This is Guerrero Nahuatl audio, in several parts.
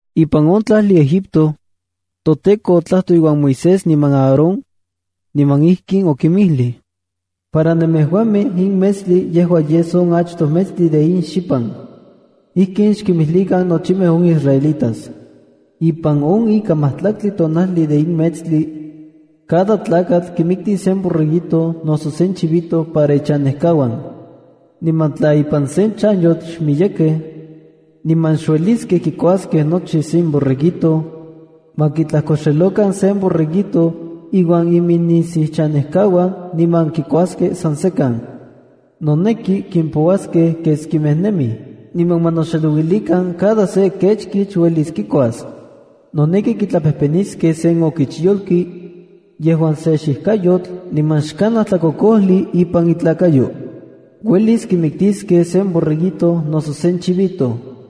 Ipan on tlajli Egipto, toTEKO otlajtoj iuan Moisés niman Aarón, niman ijkin okinmijlij: “Para nemejuamej in metstli yejua yes on achtoj metstli de in xipan. Ijkin xkimijlikan nochimej on israelitas: ‘Ipan on ika majtlaktli tonajli de in metstli, cada tlakatl kimiktis sen borreguito noso sen chivito para ichanejkauan. Niman tla ipan sen chanyotl xmiyekej niman xueliskej kikuaskej nochi sen borreguito, ma kitlajkoxelokan sen borreguito iuan iminnisiuchanejkauan niman kikuaskej san sekan. Noneki kimpouaskej keskimej nemij, niman ma noxelouilikan cada se kechkich uelis kikuas. Noneki kitlapejpeniskej sen okichyolki yejuan se xijkayotl niman xkanaj tlakokojli ipan itlakayo. Uelis kimiktiskej sen borreguito noso sen chivito.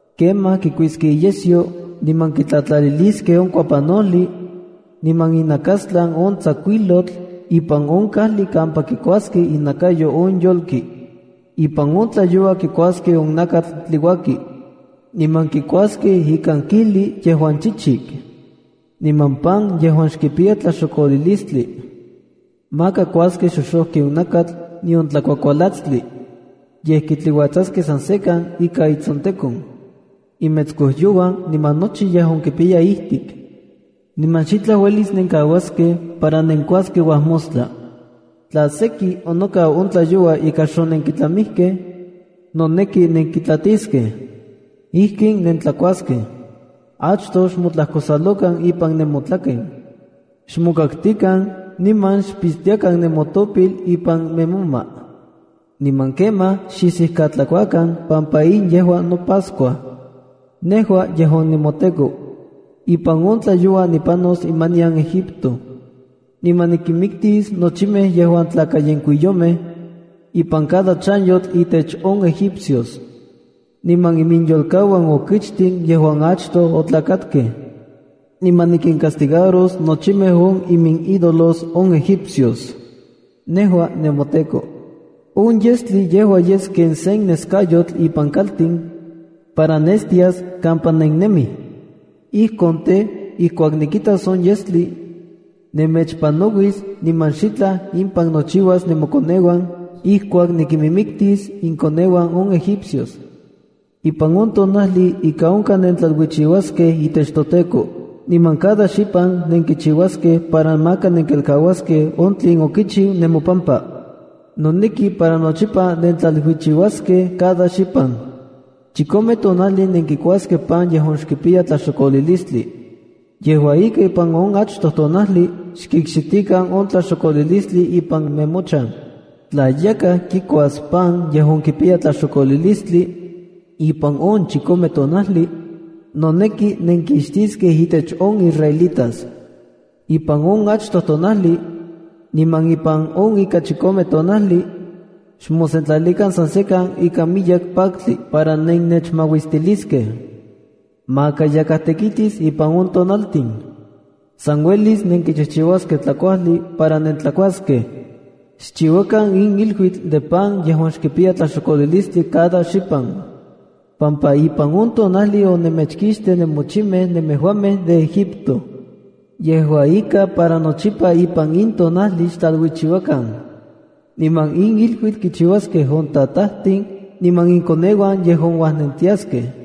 Kemaj kikuiskej iyesyo niman kitlatlaliliskej on kuapanojli niman inajnakastlan on tsakuijlotl ipan on kajli kampa kikuaskej inakayo on yolki. Ipan on tlayoua kikuaskej on nakatl tliuaki. Niman kikuaskej ikan kijli yejuan chichik, niman pan yejuan xkipiya tlaxokolilistli. Maka kuaskej xoxojki on nakatl, nion tlakuakualatstli. Yej kitliuatsaskej san sekan ika itsontekon, imetskojyouan niman nochi yejuan kipiya ijtik. Niman xitlaj uelis nenkauaskej para nenkuaskej uajmostla. Tla seki onokau on tlayoua ika xonenkitlamijkej, noneki nenkitlatiskej. “Ijkin nentlakuaskej. Achtoj xmotlajkosalokan ipan nemotlaken. Xmokaktikan, niman xpixtiakan nemotopil ipan nemoma. Niman kemaj xisijkatlakuakan pampa in yejua noPascua, nejua yejuan nemoTEKO. Ipan on tlayoua nipanos imanian Egipto, niman nikinmiktis nochimej yejuan tlakayenkuiyomej ipan cada chanyotl intech on egipcios, niman iminyolkauan okichtin yejuan achtoj otlakatkej. Niman nikincastigaros nochimej on iminídolos on egipcios. Nejua nemoTEKO. ’On yestli yejua yes ken sen neskayotl ipan kaltin para nestias kampa nennemij. Ijkon tej, ijkuak nikitas on yestli, nemechpanauis niman xitlaj impan nochiuas nemokoneuan ijkuak nikinmiktis inkoneuan on egipcios. Ipan on tonajli ika onkaj nentlaluichiuaskej itech toTEKO. Niman cada xipan nenkichiuaskej para maka nenkelkauaskej on tlen onikchiu nemopampa. Noneki para nochipa nentlaluichiuaskej cada xipan. Chikome tonajli nenkikuaskej pan yejuan xkipiya tlaxokolilistli. Yejua ika, ipan on achtoj tonajli xkixtikan on tlaxokolilistli ipan nemochan. Tla yakaj kikuas pan yejuan kipiya tlaxokolilistli ipan on chikome tonajli, noneki nenkixtiskej intech on israelitas. Ipan on achtoj tonajli niman ipan on ika chikomej tonajli xmosentlalikan san sekan ika miyek paktli para nennechmauistiliskej. Maka yakaj tekitis ipan on tonaltin. San uelis nenkichijchiuaskej tlakuajli para nentlakuaskej. Xchiuakan in iluitl de pan yejuan xkipiya tlaxokolilistli cada xipan, pampa ipan on tonajli onemechkixtij nemochimej nemejuamej de Egipto. Yejua ika, para nochipa ipan in tonajli xtlaluichiuakan. Niman in iluitl kichiuaskej on tatajtin niman inkoneuan yejuan uajnentiaskej.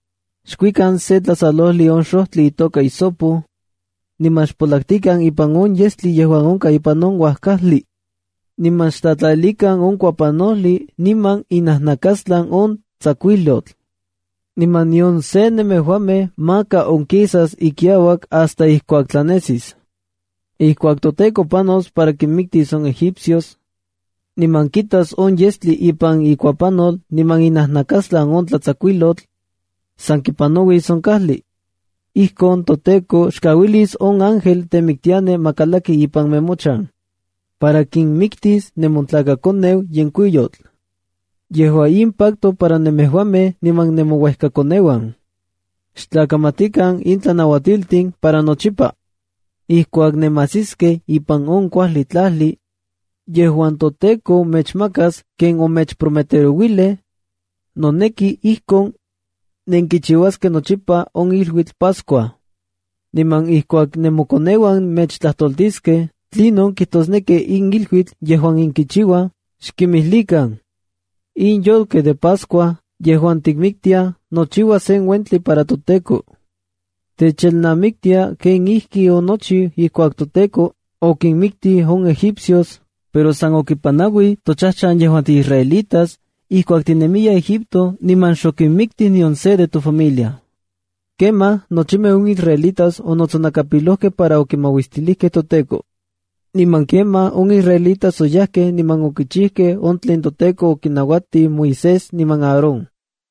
Xkuikan se tlasalojli on xojtli itoka hisopo, niman xpolaktikan ipan on yestli yejuan onkaj ipan uajkajli. Niman xtlatlalilikan on kuapanojli niman inajnakastlan on tsakuijlotl. Niman nion se nemejuamej maka onkisas ikiauak hasta ijkuak tlanesis. Ijkuak toTEKO panos para kinmiktis on egipcios, niman kitas on yestli ipan ikuapanol niman inajnakastlan on tlatsakuijlotl, san kipanauis on kajli. Ijkon toTEKO xkauilis on ángel temiktiani ma kalaki ipan nemochan para kinmiktis nemotlakakoneu yenkuiyotl. “Yejua in pacto para nemejuamej niman nemouejkakoneuan. Xtlakamatikan in tlanauatiltin para nochipa. Ijkuak nemajsiskej ipan on kuajli tlajli yejuan toTEKO mechmakas ken omechprometerouilij, noneki ijkon nenkichiuaskej nochipa on iluitl Pascua. Niman ijkuak nemokoneuan mechtlajtoltiskej tlinon kijtosneki in iluitl yejuan nenkichiuaj, xkimijlikan: ‘In yolkej de Pascua yejuan tikinmiktiaj nochiua sen uentli para toTEKO. Techelnamiktia kenijkionochiu ijkuak toTEKO okinmiktij on egipcios, pero san okipanauij tochajchan yejuan tiisraelitas ijkuak tinemiyaj Egipto niman xokimiktij nion se de tofamilia.’” Kemaj nochimej on israelitas onotsonakapilojkej para okimaustilijkej toTEKO. Niman kemaj on israelitas oyajkej niman okichijkej on tlen toTEKO okinnauatij Moisés niman Aarón.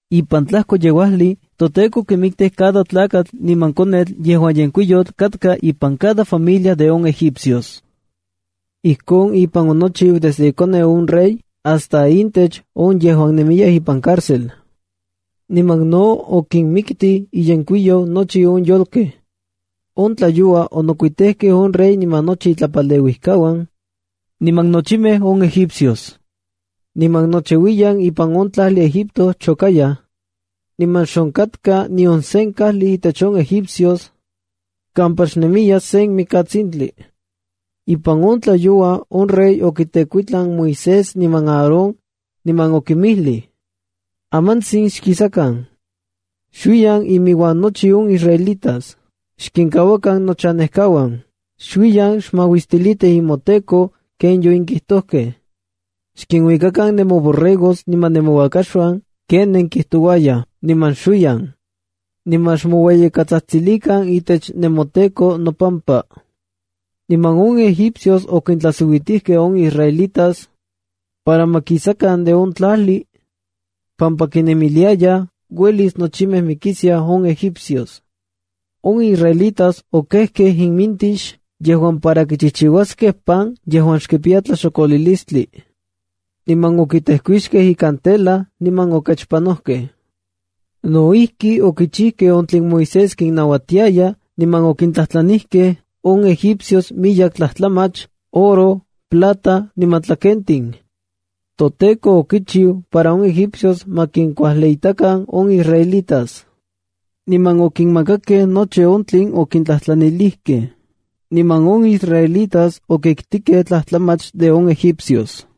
Ipan tlajkoyeuajli, toTEKO okimiktij cada tlakatl niman konetl yejuan yenkuiyotl katka ipan cada familia de on egipcios. Ijkon ipan onochiu desde ikoneu on rey hasta intech on yejuan nemiyaj ipan cárcel. Niman no okinmiktij iyenkuiyou nochi on yolkej. On tlayoua onokuitejkej on rey niman nochi itlapaleuijkauan, niman nochimej on egipcios. Niman nochiuiyan ipan on tlajli Egipto chokayaj, niman xonkatka nion sen kajli intech on egipcios kampa xnemiya sen mikatsintli. Ipan on tlayoua on rey okitekuitlan Moisés niman Aarón, niman okinmijlij: —Amantsin xkisakan. Xuiyan inmiuan nochi on israelitas. Xkinkauakan nochanejkauan. Xuiyan xmauistilitij nemoTEKO ken yonenkijtojkej. Xkinuikakan nemoborregos niman nemouakaxuan ken nenkijtouayaj, niman xuiyan. Niman xmoueyikatsajtsilikan itech nemoTEKO nopampa. Niman on egipcios okintlajsiuitijkej on israelitas para ma kisakan de on tlajli pampa kinemiliayaj uelis nochimej mikiskiaj on egipcios. On israelitas okejkej imintix, yejuan para kichijchiuaskej pan yejuan xkipiya tlaxokolilistli. Niman okitejkuixkej ikan tela niman okechpanojkej. No ijki, okichijkej on tlen Moisés kinnauatiaya niman okintlajtlanijkej on egipcios miyek tlajtlamach, oro, plata niman tlakentin. ToTEKO okichiu para on egipcios ma kinkuajliitakan on israelitas. Niman okinmakakej nochi on tlen okintlajtlanilijkej. Niman on israelitas okiktikej tlajtlamach de on egipcios.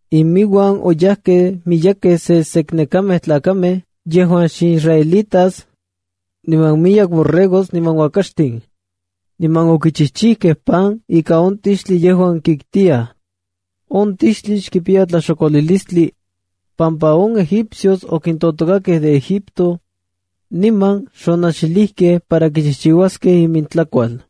Iminuan oyajkej miyekej seseknekamej tlakamej yejuan xisraelitas niman miyek borregos niman uakaxtin. Niman okichijchijkej pan ika on tixtli yejuan kiktiyaj. On tixtli xkipiya tlaxokolilistli pampa on egipcios okintotokakej de Egipto niman xonajxilijkej para kichijchiuaskej imintlakual.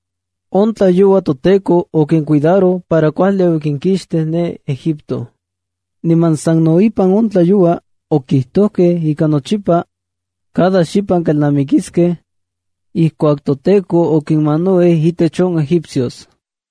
On tlayoua toTEKO okincuidaroj para kuajli okinkixtij ne Egipto. Niman sano ipan on tlayoua okijtojkej ika nochipa cada xipan kelnamikiskej ijkuak toTEKO okinmanauij intech on Egipcios.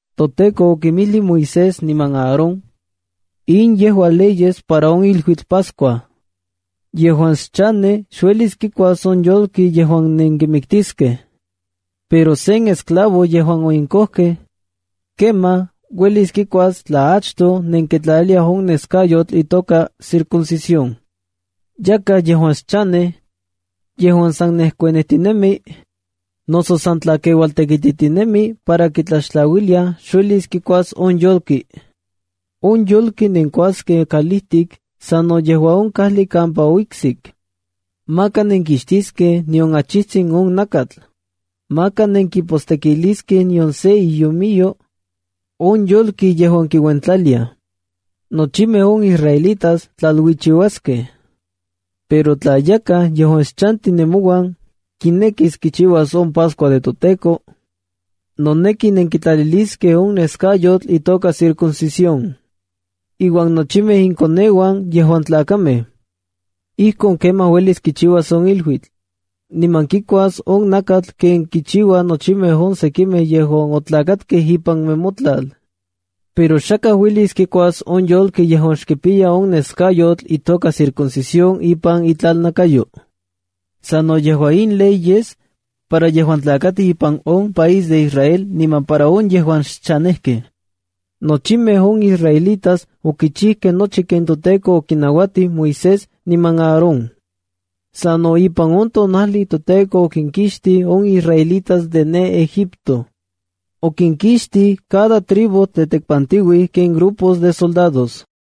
ToTEKO okinmijlij Moisés niman Aarón: “In yejua leyes para on iluitl Pascua. Yejuan xchanej xuelis kikuas on yolki yejuan nenkimiktiskej. Pero sen esclavo yejuan onenkojkej, kemaj, uelis kikuas tla achtoj nenkitlaliliaj on neskayotl itoka circuncisión. Yakaj yejuan xchanej yejuan san nejekuanijtinemi, noso san tlakeualtekititinemi para kitlaxtlauiliaj xuelis kikuas on yolki. On yolki nenkuaskej kalijtik sa no yejua on kajli kampa oiksik. Maka nekixtiskej nion achijtsin on nakatl. Maka nenkipostekiliskej nion sen iomiyo on yolki yejuan kiuentlaliaj. Nochimej on israelitas tlaluichiuaskej. Pero tla yakaj yejuan xchanti nemouan kinekis kichiuas on Pascua de toTEKO, noneki nenkitlaliliskej on neskayotl itoka circuncisión, iuan nochimej inkoneuan yejuan tlakamej. Ijkon kemaj uelis kichiuas on iluitl, niman kikuas on nakatl ken kichiuaj nochimej on sekimej yejuan otlakatkej ipan nemotlal. Pero xakaj uelis kikuas on yolki yejuan xkipiya on neskayotl itoka circuncisión ipan itlalnakayo. Sa no yejua in ley yes para yejuan tlakatij ipan on país de Israel niman para on yejuan xchanejkej.” Nochimej on israelitas okichijkej nochi ken toTEKO okinauatij Moisés niman Aarón. Sa no ipan on tonajli toTEKO okinkixtij on israelitas de ne Egipto. Okinkixtij cada tribu tetekpantiuij ken grupos de soldados.